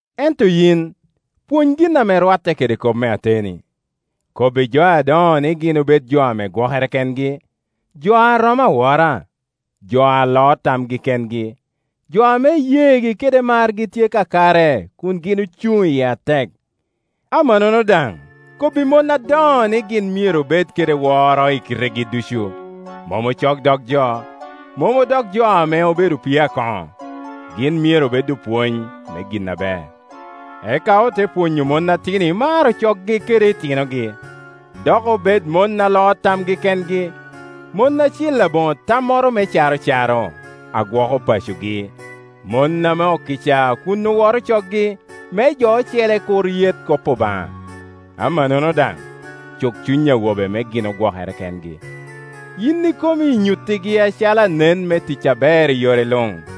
Ento yin, pwony gin ame rwatte kede kop me ateni. Kobbi jo adoŋo ni gin obed jo a gwokere kengi, jo a romo awora, jo a loo tamgi kengi, jo ame iyeegi kede margi tye kakare kun gin ocuŋ iye atek. Amannono daŋ kobbi mon adoŋo ni gin myero obed kede woro i kitegi ducu, mom ocok dog jo, mom jo odoko opii a koŋo. Gin myero obed opwony me gin aber, eka ote pwonyo mon atino imaro coggi kede otinogi, dok obed mon a loo tamgi kengi, mon acil aboŋo tammoro me caro caro, a gwoko pacogi, mon ame okica kun oworo coggi, me jo ocele kur yet kop Obaŋa. Amannono daŋ, cuk cuny awobe me gin gwokere kengi. Yin ikomi inyutte acalo anen me tic aber i yore luŋ.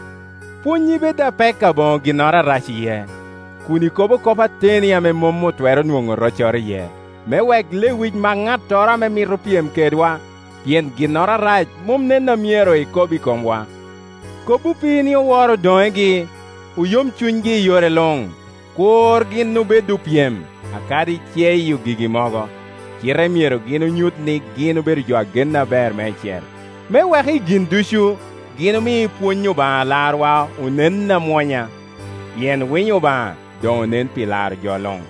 Pwonnyi bed apek aboŋo ginnoro arac iye, kun ikobo kop ateni a mom otwero nwoŋo roccoro iye, me wek lewic mak ŋattoro a mito pyem kedwa, pien ginnoro arac mom nen a myero ekob i komwa. Kob opii ni owor odoŋegi, oyom cunygi i yore luŋ. Kur gin obed opyem, kadi ceyo gigi mogo, cite myero gin onyut ni gin jo a genne aber meicel, me wek i gin ducu, gin omi pwony Obaŋa Alarwa onen amwonya. Pien winyo Obaŋa doŋ onen pi laro jo luŋ.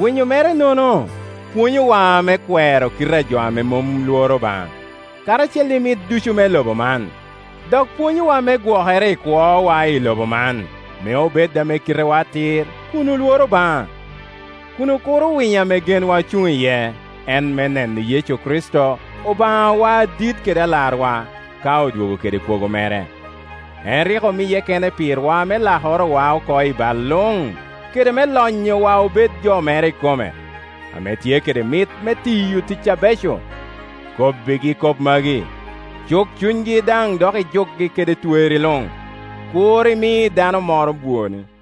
Winyo mere-nono pwonyowa me kwero kite a jo a mom lworo Obaŋa, karacel i mit ducu me lobo man, dok pwonyowa me gwokere i kwowa i lobo man, me obed ame kitewa atir, kun olworo Obaŋa, kun okuro winyo ame genwa ocuŋ iye, en me neno Yecu Kricito, Obaŋawa adit kede Alarwa, ka odwogo kede kwogo. Pet. 2.9En rik omiye kene pirwa me lakorowa oko i bal luŋ, kede me lonyowa obed jo mere ikome, ame tye kede mit me tiyo tic abeco. Kobbigi kop magi; cuk cunygi dok ijukgi kede twerri luŋ. Kur imi dano moro bwoni.